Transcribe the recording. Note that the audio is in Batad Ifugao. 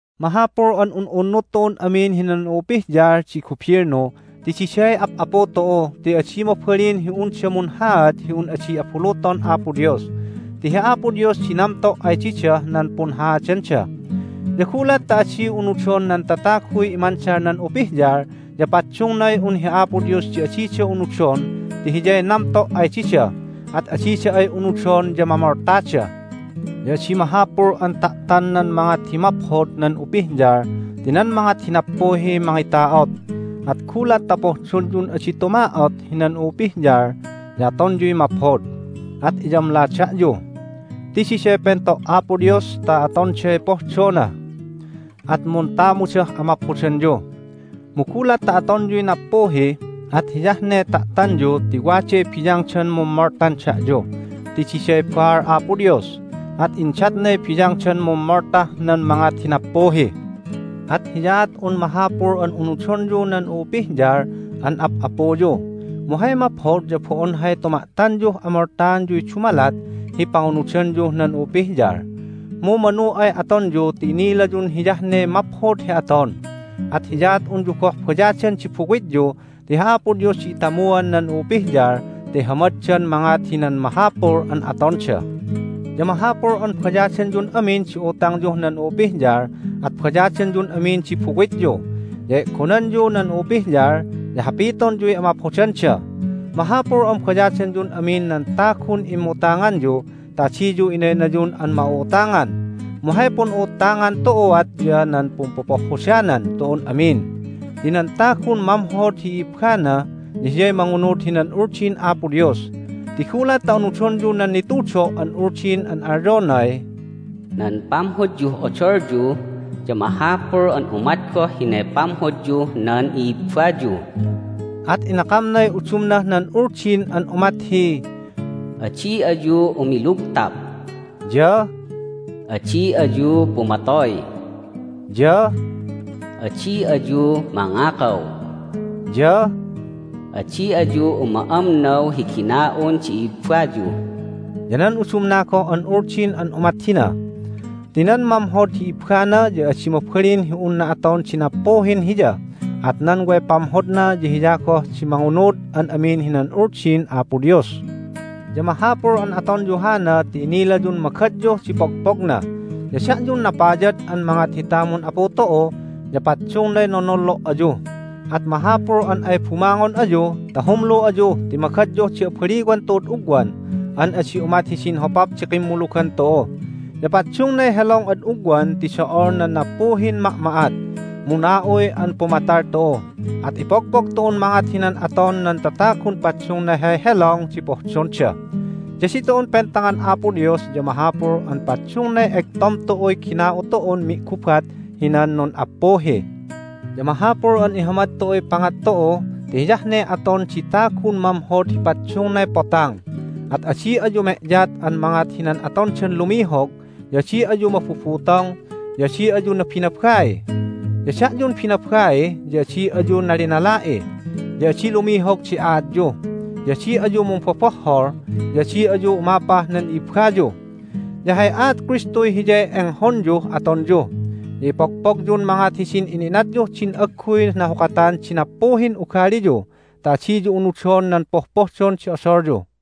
Mahapul an un'unnud tu'un amin hinan u'upihyal di gubilnu ti diday ap'apu tu'u ti adi mabalin hi unda munhaad hi un adi abuluton Apo Dios, ti hi Apo Dios di namto' ay didah nan punhaadanda. Ya gulat ta adi unudon nan tataguy imandal nan upihyal ya paddungnay un hi Apo Dios di adida unudon ti Hiyay namto' ay dida, at adida ay unudon ya mamoltada. Ya adi mahapul an ta'tan nan mangat hi maphod nan upihyal ti nan mangat hi nappuhiy mangita'ot. At gulat ta pohdonyun adi tuma'ot hinan u'upihyal ya atonyuy maphod, at iyamla da'yu. Ti diday pento' Apo Dios ta atonday pohdona, at muntamudah amaphodanyu. Mu gulat ta atonyuy nappuhi at hiyah ne ta'tanyu ti waday biyangdan mummoltan da'yu. Ti diday baal Apo Dios, at indatnay biyangdan mummoltah nan mangat hi nappuhi. At hiyaat un mahapul an unudonyu nan u'upihyal an ap'apuyu. Mu hay maphod ya bo'on hay tuma'tanyuh amoltaanyuy dumalat hi pangunudanyuh nan u'upihyal, mu manu ay atonyu ti inilayun hiyah ne maphod hi aton. At hiyaat unyu goh bayadan di buwityu ti hi Apo Dios di itamuan nan u'upihyal ta ihamaddan mangat hinan mahapul an atonda. Ya mahapul an bayadanyun amin di utangyuh nan u'upihyal, at bayadanyun amin di buwityu. Ya e'gonanyu nan u'upihyal, ya hapitonyuy amaphodanda. Mahapul an bayadanyun amin nan tagun immutanganyu ta adiyu inaynayun an ma'u'utangan. Mu hay pun'u'uttangan tu'uat ya nan pumpopohhodanan tu'un amin. Ti nan tagun mamhod hi i'ibbana ya hiyay mangunud hinan Uldin Apo Dios. Ti gulat ta unudonyu nan nitudo' an Uldin an alyonay, "Nan pamhodyuh odolyu ya mahapul an umat goh hinay pamhodyuh nan i'ibbayu," at inakamnay udumnah nan Uldin an umat hi, "Adi ayu umilugtap," ya "Adi ayu pumatoy," ya "Adi ayu mangakaw," ya "Adi ayu uma'amnaw hi gina'un di i'ibbayu," ya nan udumna goh an Uldin an umat hina. Ti nan mamhod hi ibbana ya adi mabalin hi unna aton di nappuhin hiya. At nan way pamhodna ya hiya goh di mangunud an amin hinan Uldin Apo Dios. Ya mahapul an atonyu hana ti inilayun magadyuh di pogpogna. Ya da'yun napayad an mangat hi tamun Apu tu'u ya paddungnay nonollo' ayu, at mahapul an ay bumangon ayu ta humlu ayu ti magadyuh di abaliwan tu'ud ugwan, an adi umat hidin hopap di kimmulugan tu'u. Ya paddungnay helong ad ugwan ti do'ol nan nappuhin ma'ma'at, mu na'uy an pumatal tu'u, at ipogpog tu'un mangat hinan aton nan tatagun paddungnay hay helong di pohdonda. Ya ditu'un pentangan Apo Dios ya mahapul an paddungnay egtom tu'uy gina'u tu'un mi'gubat hinan nun'appuhi. Ya mahapul an ihamad tu'uy pangat tu'u ti hiyah ne aton di tagun mamhod hi paddungnay potang. At adi ayu me'yat an mangat hinan atondan lumihog, ya adi ayu mabubutong, ya adi ayu nabinabai. Ya da'yun binabai ya adi ayu nalinala'i. Ya adi lumihog di aatyu, ya adi ayu mumbobohhol, ya adi ayu umapah nan i'ibbayu. Ya hay aat Kristuy hiyay enghonyuh atonyu. Ya ipogpogyun mangat hidin ina'inatyuh din agguy nahukatan di nappuhin ugaliyu ta adiyu unudon nan pohpohdon di odolyu.